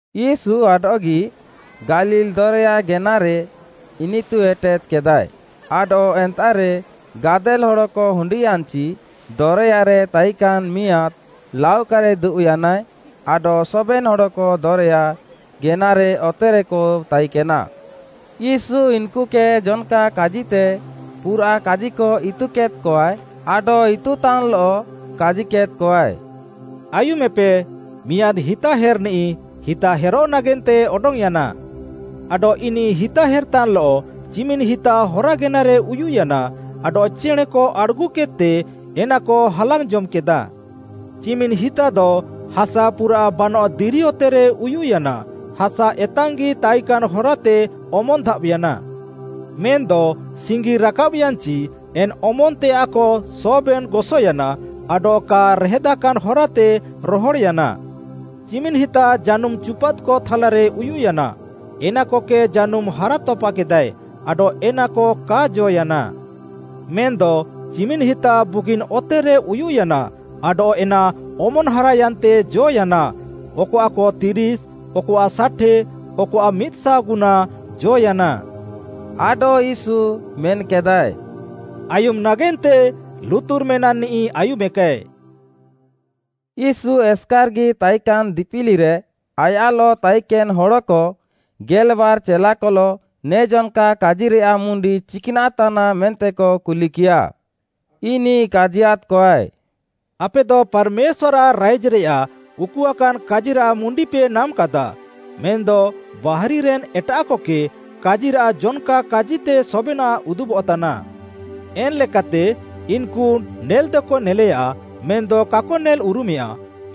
ୟୀଶୁ ଆଡଃଗି ଗାଲିଲ୍‌ ଦରେୟା ଗେନାରେ ଇନିତୁ ଏଟେଦ୍‌କେଦାଏ, ଆଡଃ ଏନ୍ତାଃରେ ଗାଦେଲ୍‌ ହଡ଼କ ହୁଣ୍ଡିୟାନ୍‌ଚି ଦରେୟାରେ ତାଇକାନ୍‌ ମିଆଁଦ୍‌ ଲାଉକାରେ ଦୁବ୍‌ୟାନାଏ ଆଡଃ ସବେନ୍‌ ହଡ଼କ ଦରେୟା ଗେନାରେ ଅତେରେକ ତାଇକେନା। ୟୀଶୁ ଇନ୍‌କୁକେ ଜନ୍‌କା କାଜିତେ ପୁରାଃ କାଜିକ ଇତୁକେଦ୍‌କଆଏ, ଆଡଃ ଇତୁକତାନ୍‌ଲଃ କାଜିକେଦ୍‌କଆଏ, “ଆୟୁମେପେ, ମିଆଁଦ୍‌ ହିତାହେର୍‌ନିଃ ହିତା ହେର୍‌ନାଗେନ୍ତେ ଅଡଙ୍ଗ୍‌ୟାନା। ଆଡଃ ଇନିଃ ହିତା ହେର୍‌ତାନ୍‌ଲଃ ଚିମିନ୍‌ ହିତା ହରା ଗେନାରେ ଉୟୁଃୟାନା ଆଡଃ ଚେଣେଁକ ଆଡ଼୍‌ଗୁକେଦ୍‌ତେ ଏନାକ ହାଲାଙ୍ଗ୍‌ ଜମ୍‌କେଦାଃ। ଚିମିନ୍‌ ହିତାଦ ହାସା ପୁରାଃ ବାନଃ ଦିରି ଅତେରେ ଉୟୁଃୟାନା, ହାସା ଏତାଙ୍ଗ୍‌ଗି ତାଇକାନ୍‌ ହରାତେ ଅମନ୍‌ ଧାବ୍‌ୟାନା। ମେନ୍‌ଦ ସିଙ୍ଗି ରାକାବ୍‌ୟାନ୍‌ଚି ଏନ୍‌ ଅମନ୍‌ତେୟାଃକ ସବେନ୍‌ ଗସୟାନା, ଆଡଃ କା ରେହେଦାକାନ୍‌ ହରାତେ ରହଡ଼୍‌ୟାନା। ଚିମିନ୍‌ ହିତା ଜାନୁମ୍‌ ଚୁପାଦ୍‌କ ଥାଲାରେ ଉୟୁଃୟାନା, ଏନାକକେ ଜାନୁମ୍‌ ହାରାତପାକେଦାଏ, ଆଡଃ ଏନାକ କା ଜ ୟାନା। ମେନ୍‌ଦ ଚିମିନ୍‌ ହିତା ବୁଗିନ୍‌ ଅତେରେ ଉୟୁଃୟାନା, ଆଡଃ ଏନା ଅମନ୍‌ ହାରାୟାନ୍ତେ ଜ ୟାନା, ଅକଆଃକ ତିରିଶ୍‌, ଅକଆଃ ଷାଠେ, ଅକଆଃ ମିଦ୍‌ଶାଅଗୁନା, ଜ ୟାନା।” ଆଡଃ ୟୀଶୁ ମେନ୍‌କେଦାଏ, “ଆୟୁମ୍‌ ନାଗେନ୍ତେ ଲୁତୁର୍ ମେନାଃନିଃ ଆୟୁମେକାଏ।” ୟୀଶୁ ଏସ୍‌କାର୍‌ଗି ତାଇକାନ୍‌ ଦିପିଲିରେ, ଆୟାଃଲଃ ତାଇକେନ୍‌ ହଡ଼କ, ଗେଲ୍‌ବାର୍‌ ଚେଲାକଲଃ, ନେ ଜନ୍‌କା କାଜିରେୟାଃ ମୁଣ୍ଡି ଚିକ୍‌ନାଃ ତାନାଃ ମେନ୍ତେକ କୁଲିକିୟାଃ? ଇନିଃ କାଜିୟାଦ୍‌କଆଏ, “ଆପେଦ ପାର୍‌ମେଶ୍ୱାର୍‌ଆଃ ରାଇଜ୍‌ରେୟାଃ ଉକୁଆକାନ୍‌ କାଜିରାଃ ମୁଣ୍ଡିପେ ନାମ୍‌କାଦାଃ। ମେନ୍‌ଦ ବାହାରିରେନ୍‌ ଏଟାଃକକେ କାଜିରାଃ ଜନ୍‌କା କାଜିତେ ସବେନାଃ ଉଦୁବଃତାନା। ଏନ୍‌ଲେକାତେ, “‘ଇନ୍‌କୁ ନେଲ୍‌ଦକ ନେଲେଆ, ମେନ୍‌ଦ କାକ ନେଲ୍‌ଉରୁମେୟାଁ,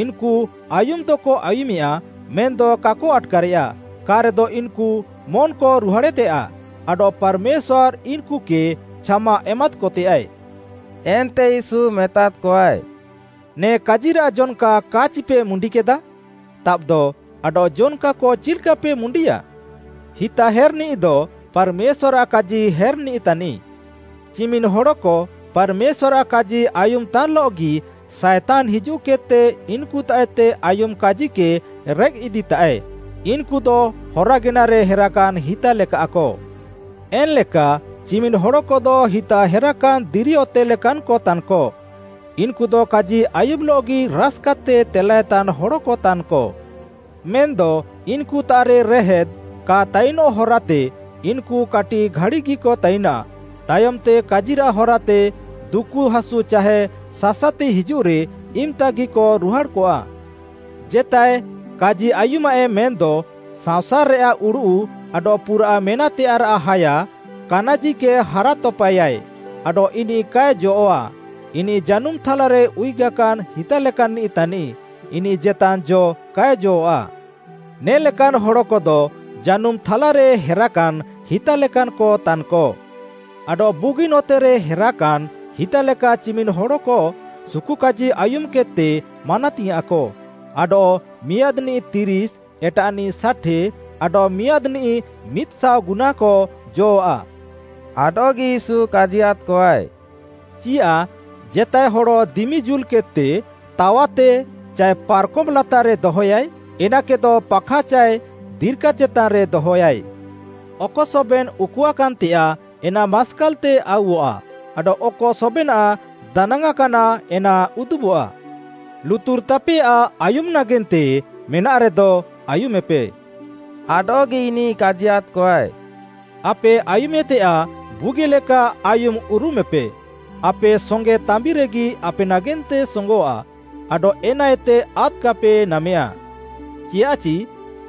ଇନ୍‌କୁ ଆୟୁମ୍‌ଦକ ଆୟୁମେୟା, ମେନ୍‌ଦ କାକ ଆଟ୍‌କାରେୟା, କା'ରେଦ ଇନ୍‌କୁ ମନ୍‌କ ରୁହାଡ଼େତେୟାଃ, ଆଡଃ ପାର୍‌ମେଶ୍ୱାର୍‌ ଇନ୍‌କୁକେ ଛାମା ଏମାଦ୍‌କତେୟାଏ।’” ଏନ୍ତେ ୟୀଶୁ ମେତାଦ୍‌କଆଏ, “ନେ କାଜିରାଃ ଜନ୍‌କା କା'ଚିପେ ମୁଣ୍ଡିକେଦା? ତାବ୍‌ଦ, ଆଡଃ ଜନ୍‌କାକ ଚିଲ୍‌କାପେ ମୁଣ୍ଡିଆ? ହିତାହେର୍‌ନିଃଦ ପାର୍‌ମେଶ୍ୱାର୍‌ଆଃ କାଜି ହେର୍‌ନିଃ ତାନିଃ। ଚିମିନ୍‌ ହଡ଼କ ପାର୍‌ମେଶ୍ୱାର୍‌ରାଃ କାଜି ଆୟୁମ୍‌ ତାନ୍‌ଲଃଗି ସାଏତାନ୍‌ ହିଜୁଃକେଦ୍‌ତେ ଇନ୍‌କୁତାଃଏତେ ଆୟୁମ୍‌ କାଜିକେ ରେଃକ୍‌ଇଦିତାଃଏ, ଇନ୍‌କୁଦ ହରା ଗେନାରେ ହେରାକାନ୍‌ ହିତା ଲେକାଃକ। ଏନ୍‌ଲେକା, ଚିମିନ୍‌ ହଡ଼କଦ ହିତା ହେରାକାନ୍‌ ଦିରିଅତେ ଲେକାନ୍‌କ ତାନ୍‌କ, ଇନ୍‌କୁଦ କାଜି ଆୟୁମ୍‌ଲଃଗି ରାସ୍‌କାତେ ତେଲାଏତାନ୍‌ ହଡ଼କ ତାନ୍‌କ। ମେନ୍‌ଦ ଇନ୍‌କୁତାଃରେ ‘ରେହେଦ୍‌’ କା ତାଇନ୍ ହରାତେ ଇନ୍‌କୁ କାଟିଃ ଘାଡ଼ିଗିକ ତାଇନାଃ, ତାୟମ୍‌ତେ କାଜିରାଃ ହରାତେ ଦୁକୁହାସୁ ଚାହେ ସାସାତି ହିଜୁଃରେ ଇମ୍‌ତାଗିକ ରୁହାଡ଼୍‌କଆଃ। ଜେତାଏ କାଜି ଆୟୁମାଃଏ ମେନ୍‌ଦ ସାଂସାର୍‌ରେୟାଃ ଉଡ଼ୁଃ ଆଡଃ ପୁରାଃ ମେନାଃତେୟାଃରାଃ ହାୟା, କାନାଜିକେ ହାରାତପାଏୟା ଆଡଃ ଇନିଃ କାଏ ଜଅଃ'ଆ, ଇନିଃ ଜାନୁମ୍‌ ଥାଲାରେ ଉୟୁଗାକାନ୍‌ ହିତା ଲେକାନ୍‌ନିଃ ତାନିଃ, ଇନିଃ ଜେତାନ୍‌ ଜ କାଏ ଜଅଃ'ଆ। ନେ ଲେକାନ୍‌ ହଡ଼କଦ ଜାନୁମ୍‌ ଥାଲାରେ ହେରାକାନ୍‌ ହିତାଲେକାନ୍‌କତାନ୍‌କ। ଆଡଃ ବୁଗିନ୍‌ ଅତେରେ ହେରାକାନ୍‌ ହିତାଲେକା ଚିମିନ୍‌ ହଡ଼କ ସୁକୁକାଜି ଆୟୁମ୍‌କେଦ୍‌ତେ ମାନାତିଙ୍ଗ୍‌ୟାଁଃକ, ଆଡଃ ମିଆଁଦ୍‌ନିଃ ତିରିଶ୍‌, ଏଟାଃନିଃ ଷାଠେ, ଆଡଃ ମିଆଁଦ୍‌ନିଃ ମିଦ୍‌ଶାଅ ଗୁନାକ, ଜ ଆଃ।” ଆଡଃଗି ୟୀଶୁ କାଜିୟାଦ୍‌କଆଏ, “ଚିୟାଃ ଜେତାଏ ହଡ଼ ଦିମି ଜୁଲ୍‌କେଦ୍‌ତେ ‘ତାୱାତେ’ ଚାଏ ପାର୍‌କମ୍‌ ଲାତାର୍‌ରେ ଦହୟାଏ? ଏନାକେଦ ପାଖା ଚାଏ ଦିର୍କା ଚେତାନ୍‌ରେ ଦହୟାଏ। ଅକ ସବେନ୍‌ ଉକୁଆକାନ୍‌ତେୟାଃ ଏନା ମାସ୍କାଲ୍‌ତେ ଆଉଃଆ, ଆଡଃ ଅକ ସବେନାଃ ଦାନାଙ୍ଗ୍‌ଆଁକାନା ଏନା ଉଦୁବଃଆ। ଲୁତୁର୍‌ ତାପେଆଃ ଆୟୁମ୍‌ ନାଗେନ୍ତେ ମେନାଃରେଦ, ଆୟୁମେପେ।” ଆଡଃଗି ଇନିଃ କାଜିୟାଦ୍‌କଆଏ, “ଆପେ ଆୟୁମେତେୟାଃ ବୁଗିଲେକା ଆୟୁମ୍ଉରୁମେପେ, ଆପେ ସଙ୍ଗେ ତାମ୍ବିରେଗି ଆପେ ନାଗେନ୍ତେ ସୋଙ୍ଗଃଆ, ଆଡଃ ଏନାଏତେ ଆଦ୍‌କାପେ ନାମେଆଁ। ଚିୟାଃଚି,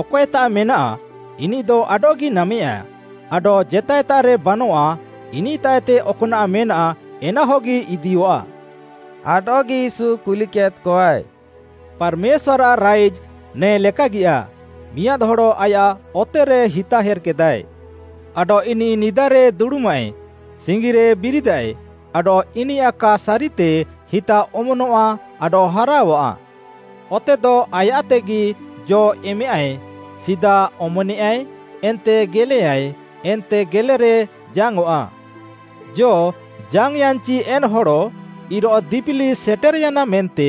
ଅକଏତାଃ ମେନାଃ ଇନିଃଦ ଆଡଃଗି ନାମେଆଁ, ଆଡଃ ଜେତାଏତାଃରେ ବାନଃଆ, ଇନିଃତାଃଏତେ ଅକ୍‌ନାଃ ମେନାଃ ଏନାହଗି ଇଦିୟଃଆ।” ଆଡଃଗି ୟୀଶୁ କୁଲିକେଦ୍‌କଆଏ, “ପାର୍‌ମେଶ୍ୱାର୍‌ଆଃ ରାଇଜ୍‌ ନେ'ଲେକାଗିଆଃ, ମିଆଁଦ୍‌ ହଡ଼ ଆୟାଃ ଅତେରେ ହିତା ହେର୍‌କେଦାଏ। ଆଡଃ ଇନିଃ ନିଦାରେ ଦୁଡ଼ୁମାଏ, ସିଙ୍ଗିରେ ବିରିଦାଏ, ଆଡଃ ଇନିୟାଃ କା ସାରିତେ ହିତା ଅମନଆଃ ଆଡଃ ହାରାଅଆଃ। ଅତେଦ ଆୟାଃତେଗି ଜ'ଏମାଃଏ, ସିଦା ଅମନେୟାଏ, ଏନ୍ତେ ଗେଲେୟାଏ, ଏନ୍ତେ ଗେଲେରେ ଜାଙ୍ଗ୍‌ଅଃଆ। ଜ ଜାଙ୍ଗ୍‌ୟାନ୍‌ଚି ଏନ୍‌ ହଡ଼, ଇରୋଃ ଦିପିଲି ସେଟେର୍‌ୟାନା ମେନ୍ତେ,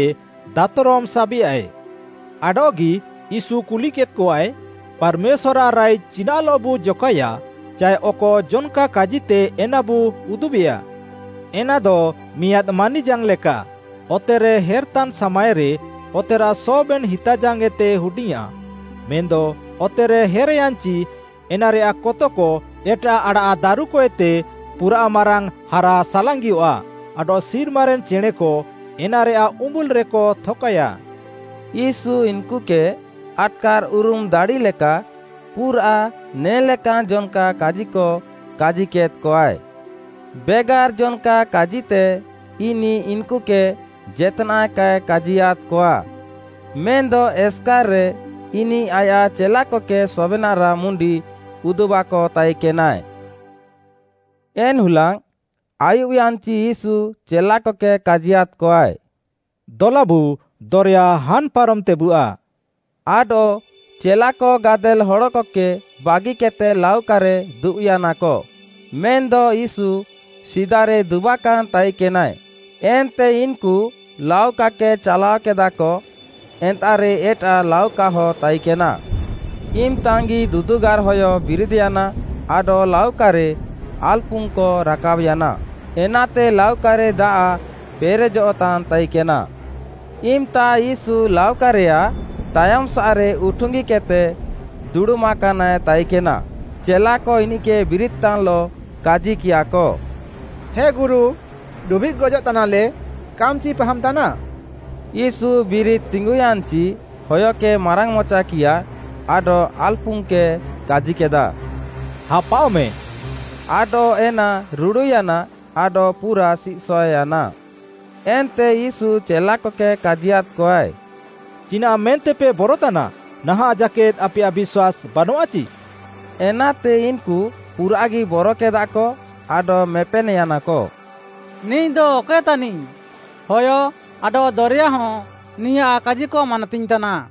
ଦାତ୍‌ରମ୍‌ ସାବେଆଏ। “ଆଡଃଗି ୟୀଶୁ କୁଲିକେଦ୍‌କଆଏ, ପାର୍‌ମେଶ୍ୱାର୍‌ଆଃ ରାଇଜ୍‌ ଚିନାଃଲଃବୁ ଜକାଏୟା ଚାଏ ଅକ ଜନ୍‌କା କାଜିତେ ଏନାବୁ ଉଦୁବେୟା। ଏନାଦ ମିଆଁଦ୍‌ ମାନିଜାଙ୍ଗ୍‌ ଲେକା, ଅତେରେ ହେର୍‌ତାନ୍‌ ସାମାଏରେ ଅତେରାଃ ସବେନ୍‌ ହିତାଜାଙ୍ଗ୍‌ ଏତେ ହୁଡିଙ୍ଗ୍‌ଆଁ, ମେନ୍‌ଦ ଅତେରେ ହେର୍‌ୟାନ୍‌ଚି ଏନାରେୟାଃ କତକ ଏଟାଃ ଆଡ଼ାଃଦାରୁକଏତେ ପୁରାଃ ମାରାଙ୍ଗ୍‌ ହାରାସାଲାଙ୍ଗିଅଃଆ, ଆଡଃ ସିର୍ମାରେନ୍‌ ଚେଣେଁକ ଏନାରେୟାଃ ଉମ୍ବୁଲ୍‌ରେକ ଥକାୟା।” ୟୀଶୁ ଇନ୍‌କୁକେ ଆଟ୍‌କାର୍‌ଉରୁମ୍‌ ଦାଡ଼ିଲେକା ପୁରାଃ ନେ'ଲେକାନ୍‌ ଜନ୍‌କା କାଜିକ କାଜିକେଦ୍‌କଆଏ। ବେଗାର୍ ଜନ୍‌କା କାଜିତେ ଇନିଃ ଇନ୍‌କୁକେ ଜେତ୍‌ନାଃ କାଏ କାଜିୟାଦ୍‌କଆ, ମେନ୍‌ଦ ଏସ୍‌କାର୍‌ରେ ଇନିଃ ଆୟାଃ ଚେଲାକକେ ସବେନାଃରାଃ ମୁଣ୍ଡି ଉଦୁବାକ ତାଇକେନାଏ। ଏନ୍‌ ହୁଲାଙ୍ଗ୍‌, ଆୟୁବ୍‌ୟାନ୍‌ଚି ୟୀଶୁ ଚେଲାକକେ କାଜିୟାଦ୍‌କଆଏ, “ଦଲାବୁ, ଦରେୟା ହାନ୍‌ ପାରମ୍‌ତେବୁଆ।” ଆଡଃ ଚେଲାକ ଗାଦେଲ୍‌ ହଡ଼କକେ ବାଗିକେଦ୍‌ତେ ଲାଉକାରେ ଦୁବ୍‌ୟାନାକ, ମେନ୍‌ଦ ୟୀଶୁ ସିଦାରେ ଦୁବାକାନ୍‌ ତାଇକେନାଏ, ଏନ୍ତେ ଇନ୍‌କୁ ଲାଉକାକେ ଚାଲାଅକେଦାଃକ, ଏନ୍ତାଃରେ ଏଟାଃ ଲାଉକାକହ ତାଇକେନା। ଇମ୍‌ତାଙ୍ଗ୍‌ଗି ଦୁଦୁଗାର୍‌ହୟ ବିରିଦ୍‌ୟାନା ଆଡଃ ଲାଉକାରେ ଆଲ୍‌ପୁଙ୍ଗ୍‌କ ରାକାବ୍‌ୟାନା, ଏନାତେ ଲାଉକାରେ ଦାଆଃ ପେରେଜଃତାନ୍‌ ତାଇକେନା। ଇମ୍‌ତା ୟୀଶୁ ଲାଉକାରେୟାଃ ତାୟମ୍‌ସାଃରେ ଉଠୁଙ୍ଗିକେଦ୍‌ତେ ଦୁଡ଼ୁମାକାନାଏ ତାଇକେନା। ଚେଲାକ ଇନିଃକେ ବିରିଦିତାନ୍‌ଲଃ କାଜିକିୟାଃକ, “ହେ ଗୁରୁ, ଡୁବିଃଗ୍‌ ଗଜଃତାନାଲେ, କାମ୍‌ଚି ପାହାମ୍‌ତାନା?” ୟୀଶୁ ବିରିଦ୍‌ତିଙ୍ଗୁୟାନ୍‌ଚି ହୟକେ ମାରାଙ୍ଗ୍‌ମଚାକିୟା ଆଡଃ ଆଲ୍‌ପୁଙ୍ଗ୍‌କେ କାଜିକେଦା, “ହାପାଅଃମେଁ,” ଆଡଃ ଏନା ରୁଡ଼ୁୟାନା, ଆଡଃ ପୁରା ସିଃସଏଃୟାନା। ଏନ୍ତେ ୟୀଶୁ ଚେଲାକକେ କାଜିୟାଦ୍‌କଆଏ, “ଚିନାଃ ମେନ୍ତେପେ ବରତାନା? ନାହାଁଃ, ଜାକେଦ୍‌ ଆପେୟାଃ ବିଶ୍ୱାସ୍‌ ବାନଃଆଚି?” ଏନାତେ ଇନ୍‌କୁ ପୁରାଃଗି ବରକେଦାଃକ, ଆଡଃ ମେପେନ୍‌ୟାନାକ, “ନିଃଦ ଅକଏ ତାନିଃ? ହୟ, ଆଡଃ ଦରେୟା ହଁ ନିୟାଃ କାଜିକ ମାନାତିଙ୍ଗ୍‌ତାନା।”